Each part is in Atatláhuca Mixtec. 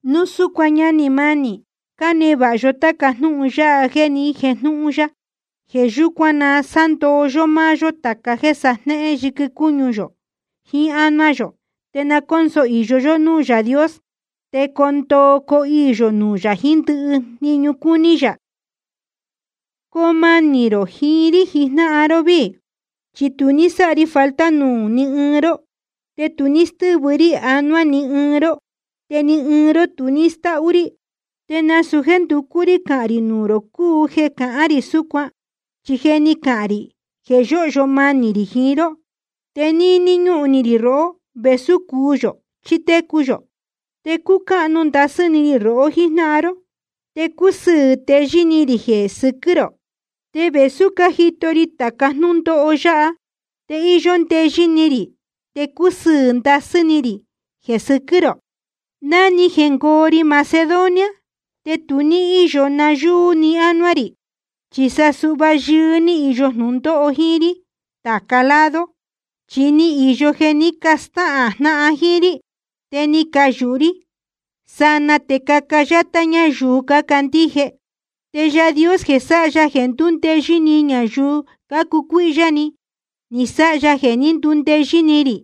Núu súcuan, ñánī mánī, cánevāha yó táca jnúhun yáha jéē ni jéjnūhun ya. Jeē yúcuan na sándoo yó máá yó tāca jéē sajnéhén yɨquɨ cúñu yō jiín ánuá yō. Te na cónso īyo yó núū Yaā Dios, te coo ndoo coo iī yō nuū yā jiín ndɨhɨ jniñu cúní yā. Coo manī rō jiín rí jijnáhan ró víī. Chi tu ní sáha ri falta nuū ní ɨɨn ró, te tu ní stɨ́vɨ rí anuá ni ɨɨn ró, te ni ɨɨn ró tu ní stáhú rí. Te nasūu jéē nducú rí cahān rī nuū rō cúu jeē cahán rī súcuan, chi je ni cahān rī jeē yóhyo manī rī jiín ró. Te níní ñúhun ni rī rohó, vēsú cuu yō chí cotecu yō. Te cúcáhnu ndasɨ́ ni rī rohó jíjnáhan ró, te cúsɨɨ̄ teyɨ́ ni rī jeē sɨquɨ́ rō. Te vēsú cájito ri tāca jnúndóho yáha, te íyó ndeyɨ́ ni rī te cúsɨɨ̄ ndasɨ́ ni rī jeē sɨquɨ́ rō. Ná ni jengoo ri Macedonia te tu ní íyo nayúú ni anuá rī, chi sa suhva yɨɨ́ ní īyo jnūndóho jíín rí tāca lado. Chi ni īyo jeē ní castáhān jnáhan jíín rí, te ni cayūhu rí sanaa te caca yátá ñáyuu cácandíje. Te Yaā Dios jeē sáha jeē ndúndeyɨ́ ni ñayuu cácucuíhyá ni, ni sáha ya jeē ní candundeyɨ́ ni rī,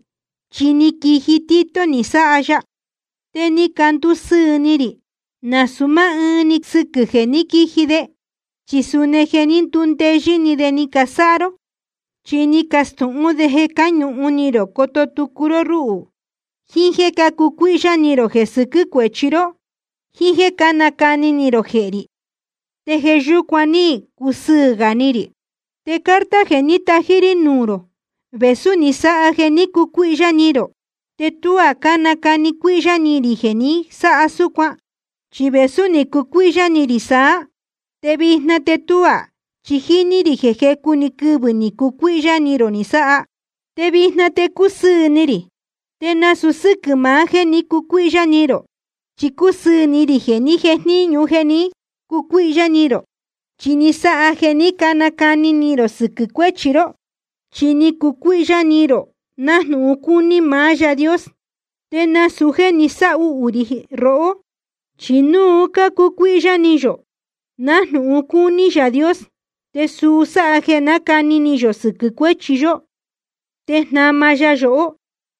chi ni quiji Tito ni sáha ya. Te ni candusɨɨ̄ ni rī, nasūu máá ɨɨn‑ni sɨquɨ̄ jeē ní quiji de, chi suni jeē ní ndundeyɨ́ ni de ni casáha ró. Chi ni castūhún de jeē cáñuhun ni rō coto tucu ró rúhū, jíín jéē cácucuíhyá ni rō jeē sɨquɨ́ cuéchi ró, jíín jéē cánacani ni rō jehē rī. Te jeē yúcuan ní cusɨɨ̄ gā ni rī. Te carta jeē ní tají rí nuū rō, vēsú ni sáha jeē ní cacucuíhyá ni rō, te tuá nácani cuíhyá ni rī jeē ni sáha súcuan. Chi vēsú ni cucuíhyá ni rī saá, te vijna te tuá, chi jíní rī jeē jecu‑ni quɨvɨ̄ ni cacucuíhyá ni rō ni sáha. Te vijna te cúsɨɨ̄ ni rī, te nasūu sɨ́quɨ̄ maá jéē ní cacucuíhyá ni rō. Chi cúsɨɨ̄ ni rī jeē ní jejníñu jeē ní cacucuíhyá ni rō, chi ni sáha jeē ní canacani ni rō sɨquɨ̄ cuéchi ró. Chi ni cacucuíhyá ni rō nájnūhun cúní maá Yaā Dios, te nasūu jéē ni sáhuhū rī rohó. Chi núu cúcuíhyá ni yō nájnūhun cúní Yaā Dios, te suu sáha jeē nácani ni yō sɨquɨ̄ cuéchi yó te jnama ya yohó,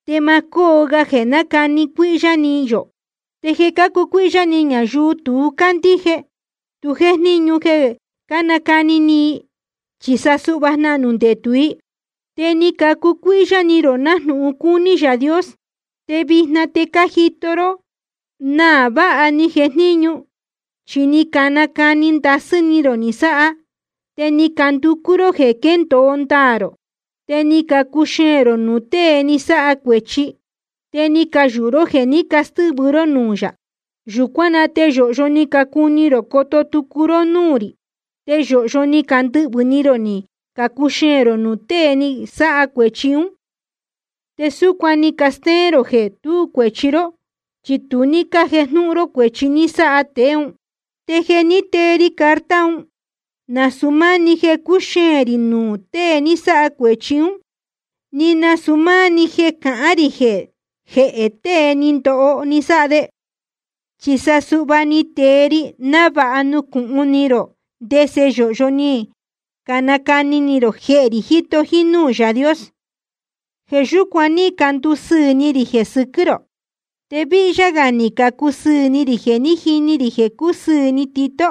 te ma cóo ga jeē nácani cuíhyá ni yō. Te jeē cácucuíhyá ni ñayuu tu cácandíje, tu jéjníñu jeē nácani ni i, chi sa jnahnū ndetū i. Te ni cacucuíhyá ni rō nájnūhun cúní Yaā Dios, te vijna te cájito ró náa vāha ni jejníñu. Chi ni canacani ndasɨ́ ni rō ni sáha, te ni canducú ró jeē quéndōo ndaā rō, te ni cacuxeēn rō nuū tée ni sáha cuēchi, te ni cayūhu ró jeē ní castɨ́vɨ ró núū yā. Yūcuán na te yōhyo ni cacuni rō coto tucu ró núū rī, te yōhyo ni candɨhvɨ̄ ni rō ni cacuxeēn rō nuū tée ni sáha cuēchi ún. Te súcuan ni castéén rō jeē tú cuēchi ró, chi tu ní cájejnúhún ró cuēchi ni sáha tēe ún. Te jeē ní tee ri carta un, nasūu máá‑ni jeē cúxeēn rī nuū tée ni sáha cuēchi ún, ni nasūu máá‑ni jeē cahán rī jehē tēe ni ndoho ni sáha de. Chi sa suhva ni tee ri návāha nucūhun ni rō ndese yōhyo ni canacani ni rō jehē rī jíto jínúū Yaā Dios. Jeē yúcuan ní candusɨɨ̄ ni rī jeē sɨquɨ́ rō. Te víhyá gā ni cacusɨɨ̄ ni rī jeē ní jini rī jeē cúsɨɨ̄ ni Tito,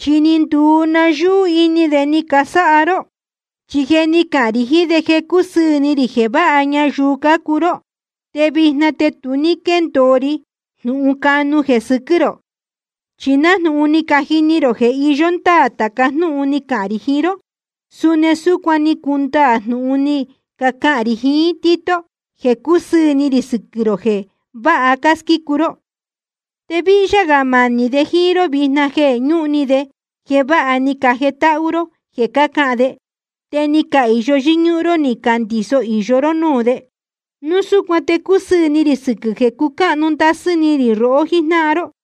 chi ni nduu nayúú ini de ni casáha ró. Chi je ni cahān rī jiín de jeē cúsɨɨ̄ ni rī jeē váha ñayuu cácuu ró, te vijna te tu ní quéndōo ri jnūhun canu jeē sɨquɨ́ rō. Chi nájnūhun ni cajini rō jeē iyó ndáā tāca jnúhun ni cacahān rī jiín ró, suni súcuan ni cundaā jnūhun ni cacahān rī jiín Tito jeē cúsɨɨ̄ ni rī sɨquɨ̄ rō jeē váha cásquícu ró. Te víhyá gā manī de jíín ró vijna jeē ñúhun ni de jeē vāha ni cajetáhú ró jeē cahán de, te ni cahīyo yɨ́ñúhún ró ni candiso īyo ró núū de. Núu súcuan te cúsɨɨ̄ ni rī sɨquɨ̄ jeē cucáhnu ndasɨ́ ni rī rohó jíjnáhan ró.